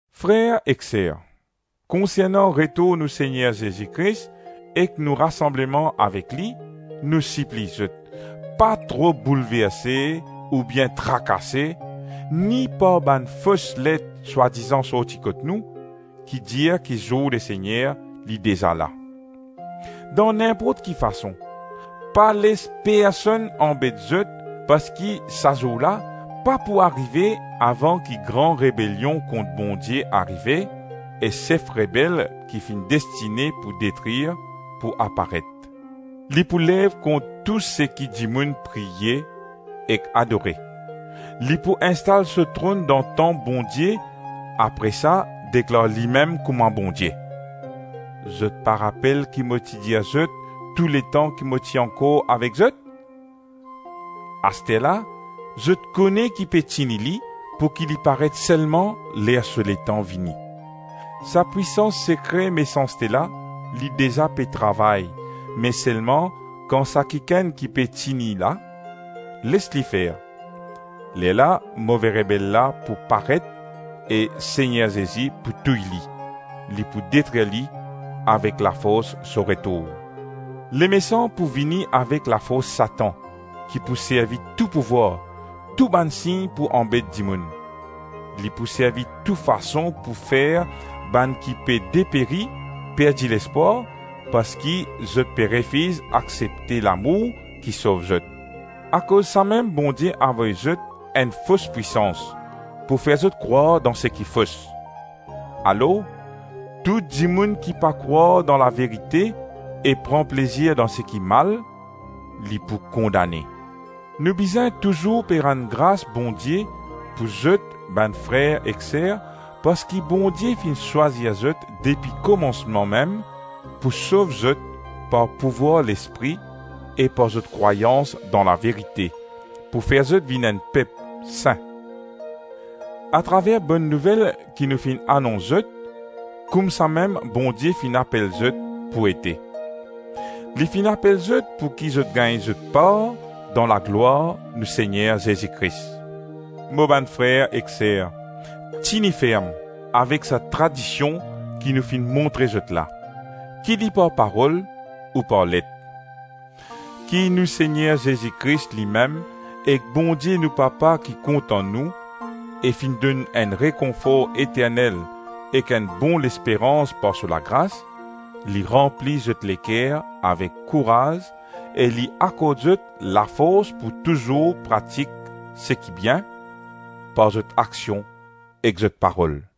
Frer ek ser, konsernan retour nou Segner Zezi Kris ek nou rasanbleman avek li, nou sipliy zot, pa tro boulverse, oubien trakase, ni par bann fos let swadizan sorti kot nou, ki dir ki zour Lesegner li deza la. Dan ninport ki fason, pa les personn anbet zot parski sa zour la pa pou arive avan ki gran rebelion kont Bondie arive e sef rebel ki finn destine pou detrir pou aparet. Li pou lev kont tou seki dimoun priye ek adore. Li pou instal so tronn dan tanp Bondie apre sa deklar limem kouma Bondie. Zot pa rapel ki mo ti dir zot tou letan ki mo ti ankor avek zot? Asterla zot kone ki pe tini li pouki li paret selman ler so letan vini. Sa pwisans sekre mesanste la, li deza pe travay, me selman kan sa kikenn ki pe tini la, les li fer; lerla move rebel la pou paret e Segner Zezi pou touy li, li pou detrir li avek lafors so retour. Lemesan pou vini avek lafors Satan, ki pou servi tou pouvwar, tou bann sign pou anbet dimoun. Li pou servi tou fason pou fer bann ki pe deperi perdi lespwar parski zot pe refiz aksepte lamour ki sov zot. Akoz samem Bondie avoy zot enn fos pwisans pou fer zot krwar dan seki fos. Alor, tou dimoun ki pa krwar dan laverite e pran plezir dan seki mal, li pou kondane. Nou bizin touzour pe rann gras Bondie pou zot bann frer ek ser, parski Bondie finn swazir zot depi komansman mem pou sov zot par pouvwar Lespri e par zot krwayans dan laverite, pou fer zot vinn enn pep sin. Atraver Bonn Nouvel ki nou finn anons zot, Koumsamem Bondie finn apel zot pou ete. Li finn apel zot pouki zot gagn zot par dan laglwar nou Segner Zezi Kris. Mo bann frer ek ser, tini ferm avek sa tradision ki nou finn montre zot la, ki li par parol ou par let. Ki nou Segner Zezi Kris limem ek Bondie nou Papa ki kontan nou e finn donn enn rekonfor eternel ek enn bon lesperans par so lagras, li ranpli zot leker avek kouraz e li akord zot lafors pou touzour pratik seki bien, par zot aksion ek zot parol.